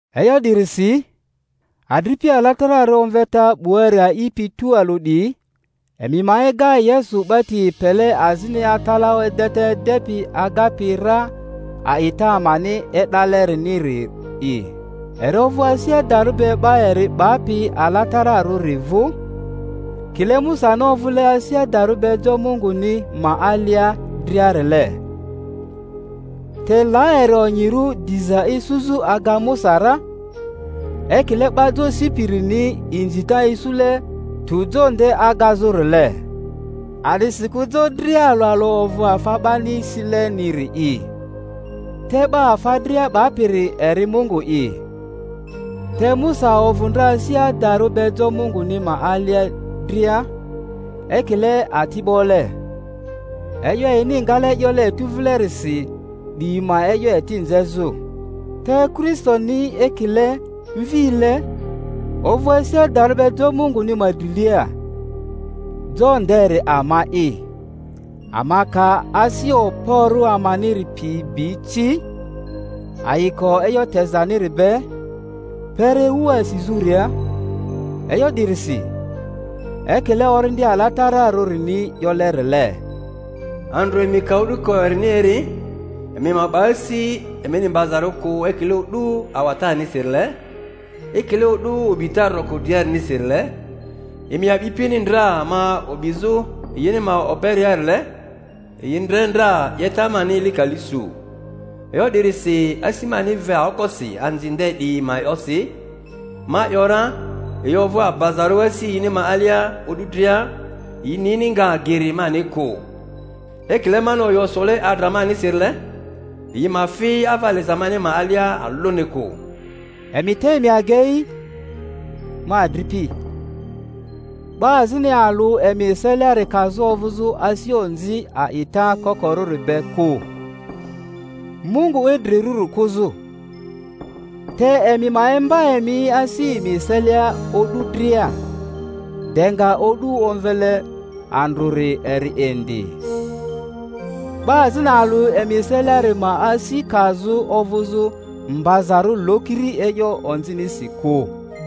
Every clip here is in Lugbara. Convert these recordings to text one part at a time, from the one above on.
E'yo 'dirisi, adripi alatararᴜ omveta 'buari a'ipi tualᴜ 'diyi, emi ma ega Yesu 'ba ti epele azini atalaᴜ edeta edepi agapi ra a'ita amani e'daleriniri'i. Eri ovᴜ asI adarᴜ be 'ba eri 'bapi atalaᴜrᴜri vᴜ, kile Musani ovᴜle asi adarᴜ be jo Munguni ma alia driarile. Te la eri onyirᴜ diza isuzᴜ aga Musa ra, ekile 'ba jo sipirini inzita isule tᴜ jo nde agazurile. A'disikᴜ jo dria alᴜ alᴜ ovᴜ afa 'bani sileniri'i, te 'ba afa dria 'bapiri eri Mungu'i. Te Musa ovᴜ ndra asi adarᴜ be jo Munguni ma alia dria ekile atibole, e'yo yini ngale 'yole etu vilerisi 'diyi ma e'yo eti nzezᴜ; te Kristoni, ekile mvile, ovᴜ asi adarᴜ be jo Munguni ma drilia. Jo nderi ama'i, ama ka asi okporᴜ amaniri pi bi ci, ayiko e'yo tezaniri be, kpere ewu asizᴜria. E'yo 'dirisi, ekile Orindi Ala-tararᴜni 'yolerile, Andrᴜ emi ka o'duko erini eri, emi ma 'ba asi emini mbazarᴜ kᴜ ekile o'du awatanisirile, ekile o'du o'bita roko driarinisi-rile, emi a'bipini ndra ma o'bizᴜ yini ma oberiarile, yi ndre ndra 'yeta mani eli kali su. E'yo 'dirisi asi mani ve aokosi anzi nde 'diyi ma e'yosi, ma ‘yora, Yi ovᴜ abazarᴜ asi yini ma alia o'du dria; yi nini nga geri mani kᴜ. Ekile mani oyo sole adra manisi-rile, Yi ma fi ava liza mani ma alia alᴜni kᴜ. Emi te emi agei, ma adripi, 'ba azini alᴜ emi eseliari kazᴜ ovᴜzᴜ asi onzi a'ita kokorᴜri be kᴜ, Mungu idrirᴜri kᴜzᴜ. Te emi ma imba emi asi emi eselia o'du dria, de nga o'du omvele andrᴜri eri indi, 'ba azini alᴜ emi eseliari ma asi kazᴜ ovᴜzᴜ mbazarᴜ lokiri e'yo onzinisi kᴜ.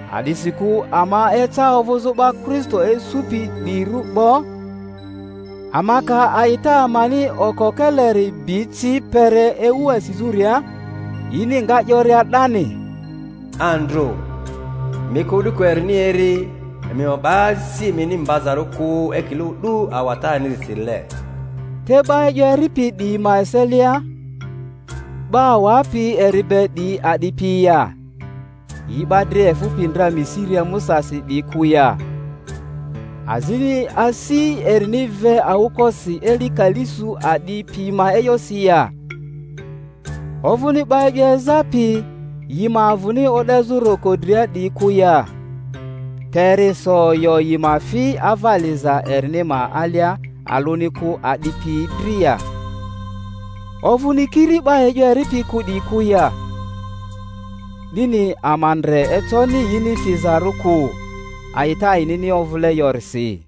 A'disikᴜ ama eca ovᴜzᴜ 'ba Kristo isupi 'diyirᴜ 'bo, ama ka a'ita amani okokeleri bi ci kpere ewu asizᴜria, yini nga 'yoria 'dani, Andrᴜ emi ka o'duko erini eri emi ma 'ba asi emini mbazarᴜ kᴜ ekile o'du awatanisirile. Te 'ba e'yo eripi 'diyi ma eselia, 'ba awapi eri be 'diyi a'di piyi ya? Yi 'ba dria efᴜpi ndra Misiria Musasi 'diyi kᴜ ya? Azini asi erini ve aokosi eli kali su a'di piyi ma e'yosi ya? Ovᴜni 'ba e'yo ezapi, yi ma avᴜni o'dezᴜ roko dria 'diyi kᴜ ya? Te eri so oyo yi ma fi ava liza erini ma alia alᴜni kᴜ a'di piyi dri ya? Ovᴜni kiri 'ba e'yo eripi kᴜ 'diyi kᴜ ya? 'Dini ama ndre econi yini fizarᴜ kᴜ, a'ita yinini ovᴜle yorisi.